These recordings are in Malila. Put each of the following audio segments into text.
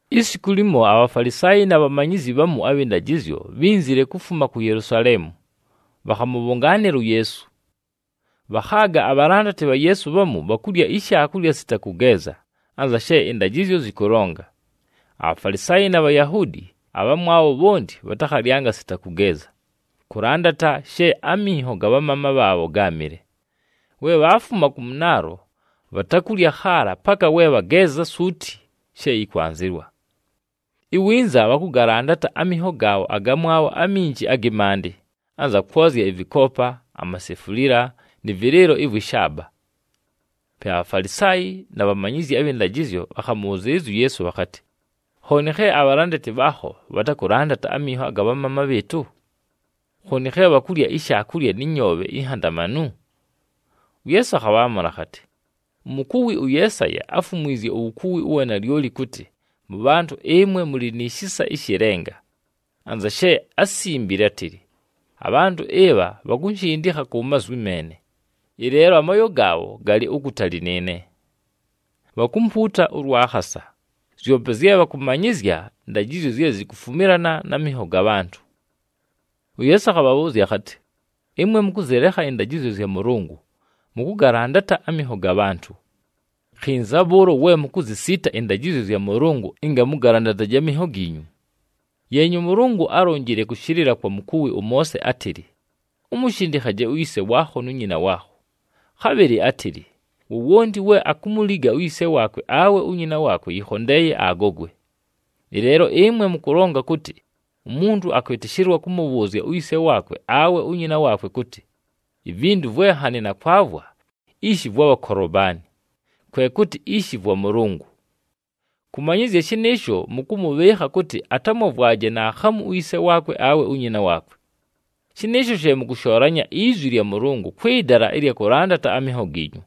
Isiku limo, aBhafalisaayi na bhamanyizyi bhamu abhɨ ndajɨzyo, bhínzile kufuma ku Yelusaleemu, bhakhamʉbhʉngaanɨla uYeesu. Bhakhaaga abhalandati bha Yeesu bhamu bhakulya ishaakulya sita kʉgeeza, anza she ɨndajɨzyo zɨkʉlonga. ABhafalisaayi na Bhayahuudi abhamwabho bhonti bhatakhalyanga sita kʉgeeza, kʉlandata she aminho ga bhamaama bhaabho gáamɨle. We bhaafuma kʉ mʉnaalo, bhatakulya khaala, paka we bhageeza suuti she yɨkwanzɨwa. Iwinza bhakʉgalandata aminho gaabho agamwabho aminji agɨ maandɨ, anza kwozya ɨvɨkoopa, amasefulila, nɨ vɨlɨɨlo ɨvwɨ shaaba. Pe aBhafalisaayi na bhamanyizyi abhɨ ndajɨzyo bhakhamʉbhʉzɨɨlɨzya uYeesu bhakhatɨ, “Khooni khe abhalandati bhaakho bhatakʉlandata aminho aga bhamaama bhɨɨtʉ? Khooni khe bhakulya ishaakulya nɨ nyoobhe inhandamanu?” UYeesu akhabhaamʉla akhatɨ, “Umukuwi ʉYeesaya áfumwizye uwukuwi ʉwa nalyoli kʉtɨ mʉbhantʉ ɨmwe mʉlɨ ni shisa ɨshɨ lenga, anza she ásimbile átɨlɨ, ‘Abhantʉ ɨbha bhakunshindikha ku mazwi meene, ɨleelo amooyo gaabho galɨ ukutali nɨɨne. Bhakumpuuta ʉlwa khasa. Zyope zye bhakʉmanyɨzya ndajɨzyo zye zikufumilana na minho ga bhantʉ.’” UYeesu akhabhabhʉʉzya akhatɨ, “Ɨmwe mʉkʉzɨlekha ɨndajɨzyo zya Mʉlʉngʉ, mʉkʉgalandata aminho ga bhantʉ. “Khinza bhʉʉlo we mukuzisiita ɨndajɨzyo zya Mʉlʉngʉ, ɨnga mʉgalandataje aminho giinyu! Yeenya, ʉMʉlʉngʉ álonjile kʉshɨlɨla kwa mukuwi ʉMoose átɨlɨ, ‘Umushindikhaje uyise waakho nu nyina waakho.’ Khabhɨlɨ átɨlɨ, ‘Wowonti we akumuliga uyise waakwe awe unyina waakwe, yɨkhondeeye agogwe.’ Ɨleelo ɨmwe mʉkʉlonga kʉtɨ umuntu akwɨtɨshɨlwa kʉmʉbhʉʉzya uyise waakwe awe unyina waakwe kʉtɨ, ‘Ivintu vwe nhanɨ nakwavwa, ishi vwabha Kolobani,’ kwe kʉtɨ, ‘Ishi vwa Mʉlʉngʉ.’ Kʉmanyɨzya shɨnɨɨsho mʉkʉmʉbhɨɨkha kʉtɨ atamwavwaje naakhamu uyise waakwe awe unyina waakwe. Shɨnɨɨsho she mʉkʉshoolanya izwi lya Mʉlʉngʉ kwɨ dala ɨlya kʉlandata aminho giinyu.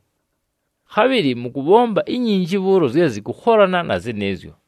Khabhɨlɨ mʉkʉbhomba inyinji bhʉʉlo zye zɨkʉkholana na zɨnɨɨzyo.”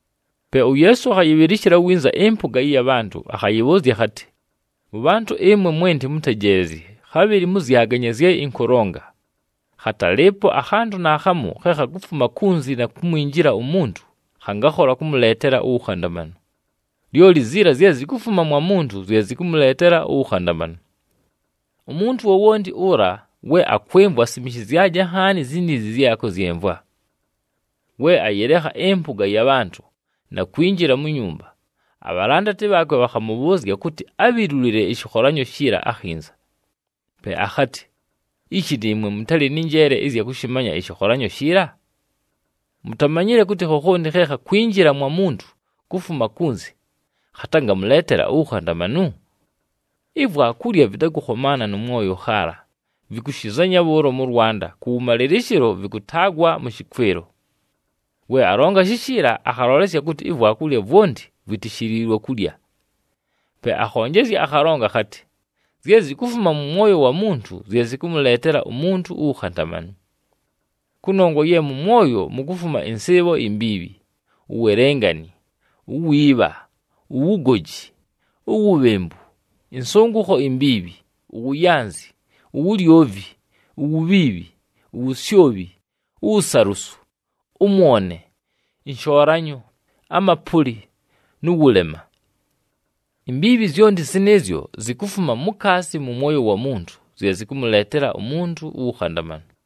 Pe uYeesu akhayɨbhɨlɨshɨla winza ɨmpʉga ɨya bhantʉ, akhayɨbhʉʉzya akhatɨ, “Mʉbhantʉ ɨmwe mwenti mʉntejeelezye, khabhɨlɨ mʉzyaganye zye ɨnkʉlonga! Khatalɨɨpo akhantʉ naakhamu khe khakufuma kunzi na kumwinjila umuntu, khangakhola kʉmʉleetela uwukhandamanu. Lyoli ziila zye zikufuma mwa muntu zye zɨkʉmʉleetela uwukhandamanu. [ Umuntu wowonti ʉla we akwɨmvwa, asimishizyaje nhaani ziniizi zye akʉzyɨmvwa.]” We ayɨlekha ɨmpʉga ya bhantʉ na kwinjila mu nyumba, abhalandati bhaakwe bhakhamʉbhʉʉzya kʉtɨ abhilulile ɨshɨkholanyo shiila akhinza. Pe akhatɨ, “Ishi nɨɨmwe mʉtalɨ nɨ njeele ɨzya kʉshɨmanya ɨshɨkholanyo shiila? Mutamanyile kʉtɨ khokhonti khe khakwinjila mwa muntu kufuma kunzi khatangamʉleetela uwukhandamanu? Ivwakulya vɨtakʉkhomaana nʉ mwoyo khaala, vɨkʉshɨzanya bhʉʉlo mʉ lwanda, kʉwʉmalɨlɨshɨlo vɨkʉtaagwa mʉ shɨkwɨlo.” We alonga shishiila, akhalolesya kʉtɨ ivwakulya vwonti vwitishiliilwe kulya. Pe akhonjezya akhalonga akhatɨ, “Zye zikufuma mʉ mwoyo wa muntu zye zɨkʉmʉleetela umuntu uwukhandamanu. Kʉnongwa ye mʉ mwoyo, mukufuma ɨnsɨɨbho imbiibhi, uwelengani, uwiibha, uwugoji, uwubhembu, ɨnsʉngʉkho imbiibhi, uwuyanzi, uwulyovi, uwubhiibhi, uwusyobhi, uwusalusu, ʉmwone, ɨnshoolanyo, amapʉlɨ, nʉ wʉlema. Imbiibhi zyonti zɨnɨɨzyo zikufuma mukaasi mʉ mwoyo wa muntu zye zɨkʉmʉleetela umuntu uwukhandamanu.”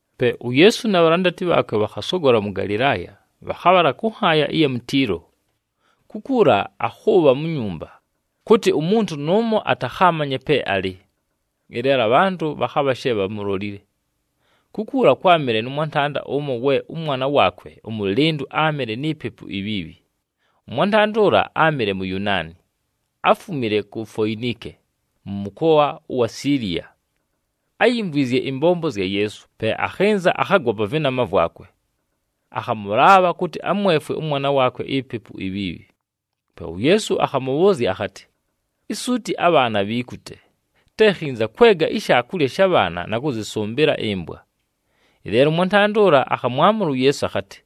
Pe uYeesu na bhalandati bhaakwe bhakhasogola mʉ Galɨlaaya, bhakhabhala kʉ nhaaya ɨya mu Tiilo. Kukuula akhʉʉbha mu nyumba, kʉtɨ umuntu nʉʉmo atakhaamanye pe alɨ. Ɨleelo abhantʉ bhakhabha she bhamulolile. Kukuula kwámɨle nʉ mwantanda ʉmo we ʉmwana waakwe ʉmʉlɨndʉ áamɨle ni pepu ibhiibhi. Ʉmwantanda ʉla áamɨle Muyunaani, áfumile ku Foinike mʉ mʉkoa ʉwa Siiliya. Áyimvwizye ɨmbombo zya Yeesu, pe akhɨnza, akhagwa pa vɨnama vwakwe. Akhamʉlaabha kʉtɨ amwefwe ʉmwana waakwe ipepu ibhiibhi. Pe uYeesu akhamʉbhʉʉzya akhatɨ, “Isuuti abhaana bhiikute. Te khinza kwega ishaakulya sha bhaana na kʉzɨsʉmbɨla ɨmbwa.” Ɨleelo ʉmwantanda ʉla akhamwamʉla uYeesu akhatɨ,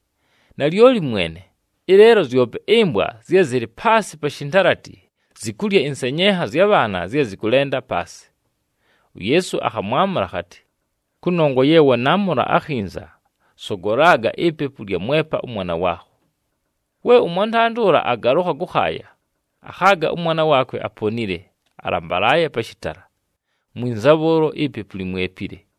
“Nalyoli Mwene, ɨleelo zyope ɨmbwa zye zɨlɨ paasɨ pa shintalati, zikulya ɨnsenyenha zya bhaana zye zɨkʉlenda paasɨ.” UYeesu akhamwamʉla akhatɨ, “Kʉnongwa ye wanaamʉla akhinza, sogolaga ipepu lyamwepa ʉmwana waakho.” We ʉmwantanda ʉla agalʉkha kʉkhaaya, akhaaga ʉmwana waakwe aponile, alambalaaye pa shɨtala, mwinza bhʉʉlo, ipepu limwepile.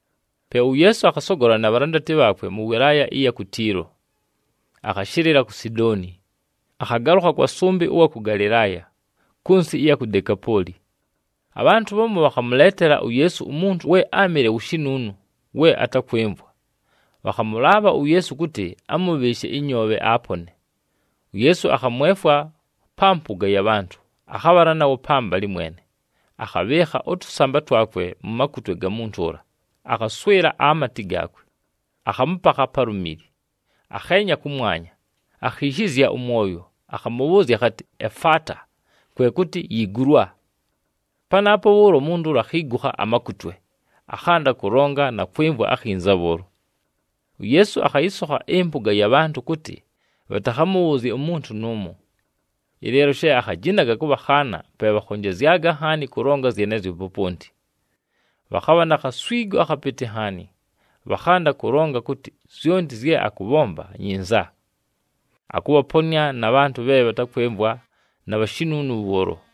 Pe uYeesu akhasogola na bhalandati bhaakwe mʉ wɨlaaya ɨya ku Tiilo, akhashɨlɨla ku Sidooni, akhagalʉkha kwa sʉmbɨ ʉwa kʉ Galɨlaaya, kʉ nsɨ ɨya ku Dekapooli. Abhantʉ bhamu bhakhamʉleetela uYeesu umuntu we áamɨle wu shinuunu we atakwɨmvwa. Bhakhamʉlaabha uYeesu kʉtɨ amʉbhɨɨshe ɨnyoobhe, apone. UYeesu akhamwefwa pa mpʉga ya bhantʉ, akhabhala nawo pambalɨ mwene, akhabhɨɨkha ʉtʉsamba twakwe mu makutwe ga muntu ʉla, akhaswɨla amatɨ gaakwe, akhamʉpakha pa lumili. Akheenya kʉmwanya, akhiishizya ʉmwoyo, akhamʉbhʉʉzya akhatɨ, “Efaata!” Kwe kʉtɨ, “Yiigulwa!” Panaapo bhʉʉlo, umuntu ʉla akhiigukha amakutwe, akhanda kʉlonga na kwɨmvwa akhinza bhʉʉlo. UYeesu akhayɨsokha ɨmpʉga ya bhantʉ kʉtɨ bhatakhamʉbhʉʉzye umuntu nʉʉmo. Ɨleelo she akhajinaga kʉbhakhaana, pe bhakhonjezyaga nhaani kʉlonga zyenezyo poponti. Bhakhabha na khaswigo akhapɨtɨ nhaani. Bhakhanda kʉlonga kʉtɨ, “Zyonti zye akʉbhomba, nyinza. Akʉbhaponɨa na bhantʉ bhe bhatakwɨmvwa na bhashinuunu bhʉʉlo!”